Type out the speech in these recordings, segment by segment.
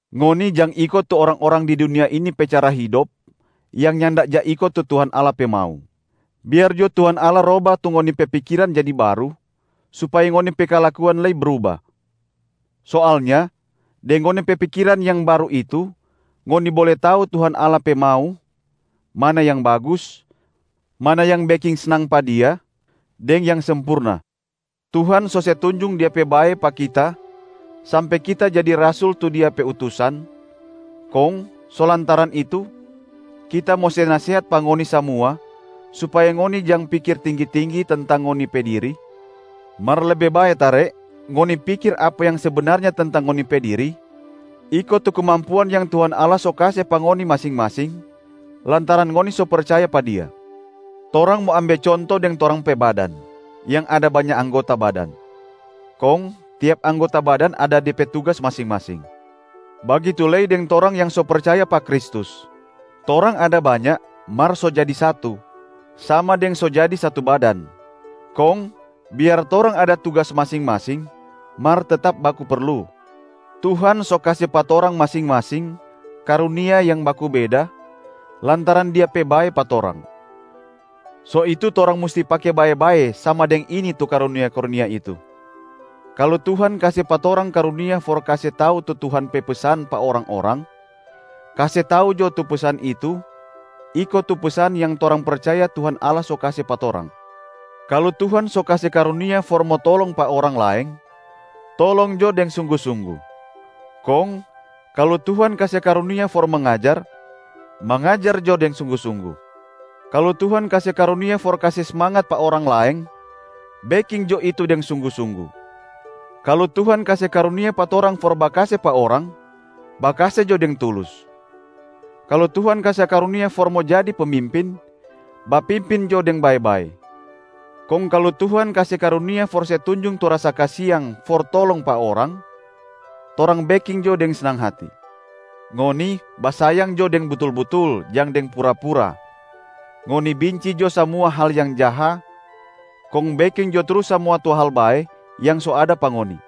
Ngoni jang iko tu orang-orang di dunia ini pe cara hidop yang nyanda ja iko tu Tuhan Allah pe mau. Biar jo Tuhan Allah roba tu ngoni pe pikiran jadi baru supaya ngoni pe kalakuan lei bruba. Soalnya deng ngoni pe pikiran yang baru itu ngoni bole tau Tuhan Allah pe mau: mana yang bagus, mana yang beking snang pa Dia deng yang sempurna. Tuhan so se tunjung Dia pe bae pa kita sampe kita jadi rasul tu Dia pe utusan, kong so lantaran itu kita mo se nasehat pa ngoni samua supaya ngoni jang pikir tinggi-tinggi tentang ngoni pe diri, mar lebe bae tare ngoni pikir apa yang sebenarnya tentang ngoni pe diri iko tu kemampuan yang Tuhan Allah so kase pa ngoni masing-masing lantaran ngoni so percaya pa Dia. Torang mo ambe conto deng torang pe badan yang ada banya anggota badan, kong tiap anggota badan ada de pe tugas masing-masing. Bagitu lei deng torang yang so percaya pa Kristus. Torang ada banya mar so jadi satu, sama deng so jadi satu badan. Kong biar torang ada tugas masing-masing mar tetap baku perlu. Tuhan so kase pa torang masing-masing karunia yang baku beda lantaran Dia pe bae pa torang. So itu torang musti pake bae-bae sama deng ini tu karunia-karunia itu: kalu Tuhan kase pa torang karunia for kase tau tu Tuhan pe pesan pa orang-orang, kase tau jo tu pesan itu iko tu pesan yang torang percaya Tuhan Allah so kase pa torang. Kalu Tuhan so kase karunia for mo tolong pa orang laeng, tolong jo deng sunggu-sunggu. Kong kalu Tuhan kase karunia for mangajar, mangajar jo deng sunggu-sunggu. Kalu Tuhan kase karunia for kase smangat pa orang laeng, beking jo itu deng sunggu-sunggu. Kalu Tuhan kase karunia pa torang for bakase pa orang, bakase jo deng tulus. Kalu Tuhan kase karunia for mo jadi pemimpin, bapimpin jo deng bae-bae. Kong kalu Tuhan kase karunia for se tunjung tu rasa kasiang for tolong pa orang, torang beking jo deng snang hati. Ngoni basayang jo deng butul-butul, jang deng pura-pura. Ngoni binci jo samua hal yang jaha, kong beking jo trus samua tu hal bae yang so ada pa ngoni.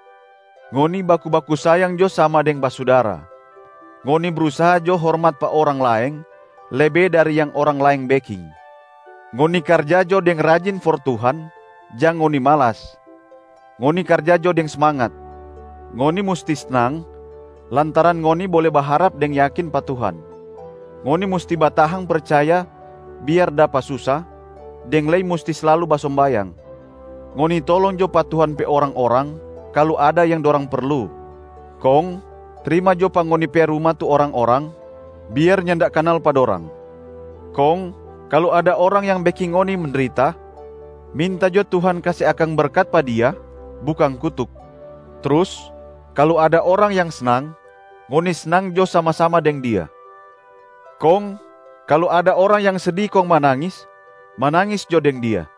Ngoni baku-baku sayang jo sama deng basudara. Ngoni brusaha jo hormat pa orang laeng lebe dari yang orang laeng beking. Ngoni karja jo deng rajin for Tuhan, jang ngoni malas. Ngoni karja jo deng smangat. Ngoni musti snang lantaran ngoni bole baharap deng yakin pa Tuhan. Ngoni musti batahang percaya biar dapa susa, deng lei musti slalu basombayang. Ngoni tolong jo pa Tuhan pe orang-orang kalu ada yang dorang perlu. Kong trima jo pa ngoni pe ruma tu orang-orang biar nyanda kanal pa dorang. Kong kalu ada orang yang beking ngoni mendrita, minta jo Tuhan kase akang berkat pa dia bukang kutuk. Trus kalu ada orang yang snang, ngoni snang jo sama-sama deng dia. Kong kalu ada orang yang sedi kong manangis, manangis jo deng dia.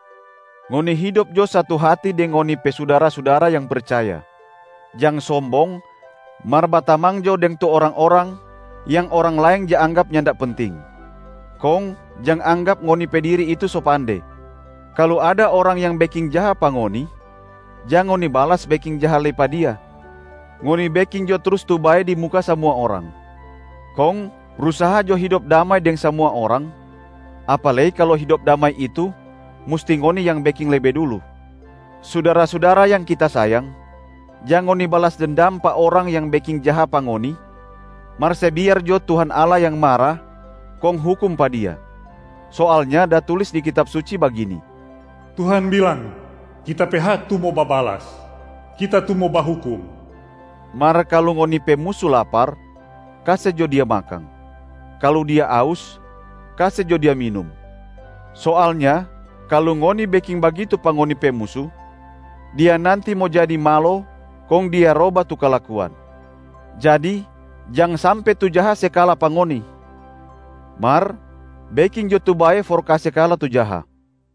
Ngoni hidop jo satu hati deng ngoni pe sudara-sudara yang percaya. Jang sombong mar batamang jo deng tu orang-orang yang orang laeng ja anggap nyanda penting. Kong jang anggap ngoni pe diri itu so pande. Kalu ada orang yang beking jaha pa ngoni, jang ngoni balas beking jaha lei pa dia. Ngoni beking jo trus tu bae di muka samua orang. Kong brusaha jo hidop damai deng samua orang, apa lei kalu hidop damai itu musti ngoni yang beking lebe dulu. Sudara-sudara yang kita sayang, jang ngoni balas dendam pa orang yang beking jaha pa ngoni mar se biar jo Tuhan Allah yang mara kong hukum pa dia. Soalnya da tulis di Kitab Suci bagini, “Tuhan bilang, Kita pe hak tu mo babalas, Kita tu mo bahukum.” “Mar kalu ngoni pe musu lapar, kase jo dia makang. Kalu dia aus, kase jo dia minum. Soalnya kalu ngoni beking bagitu pa ngoni pe musu, dia nanti mo jadi malo kong dia roba tu kalakuan.” Jadi jang sampe tu jaha se kala pa ngoni. Mar beking jo tu bae for kase kala tu jaha.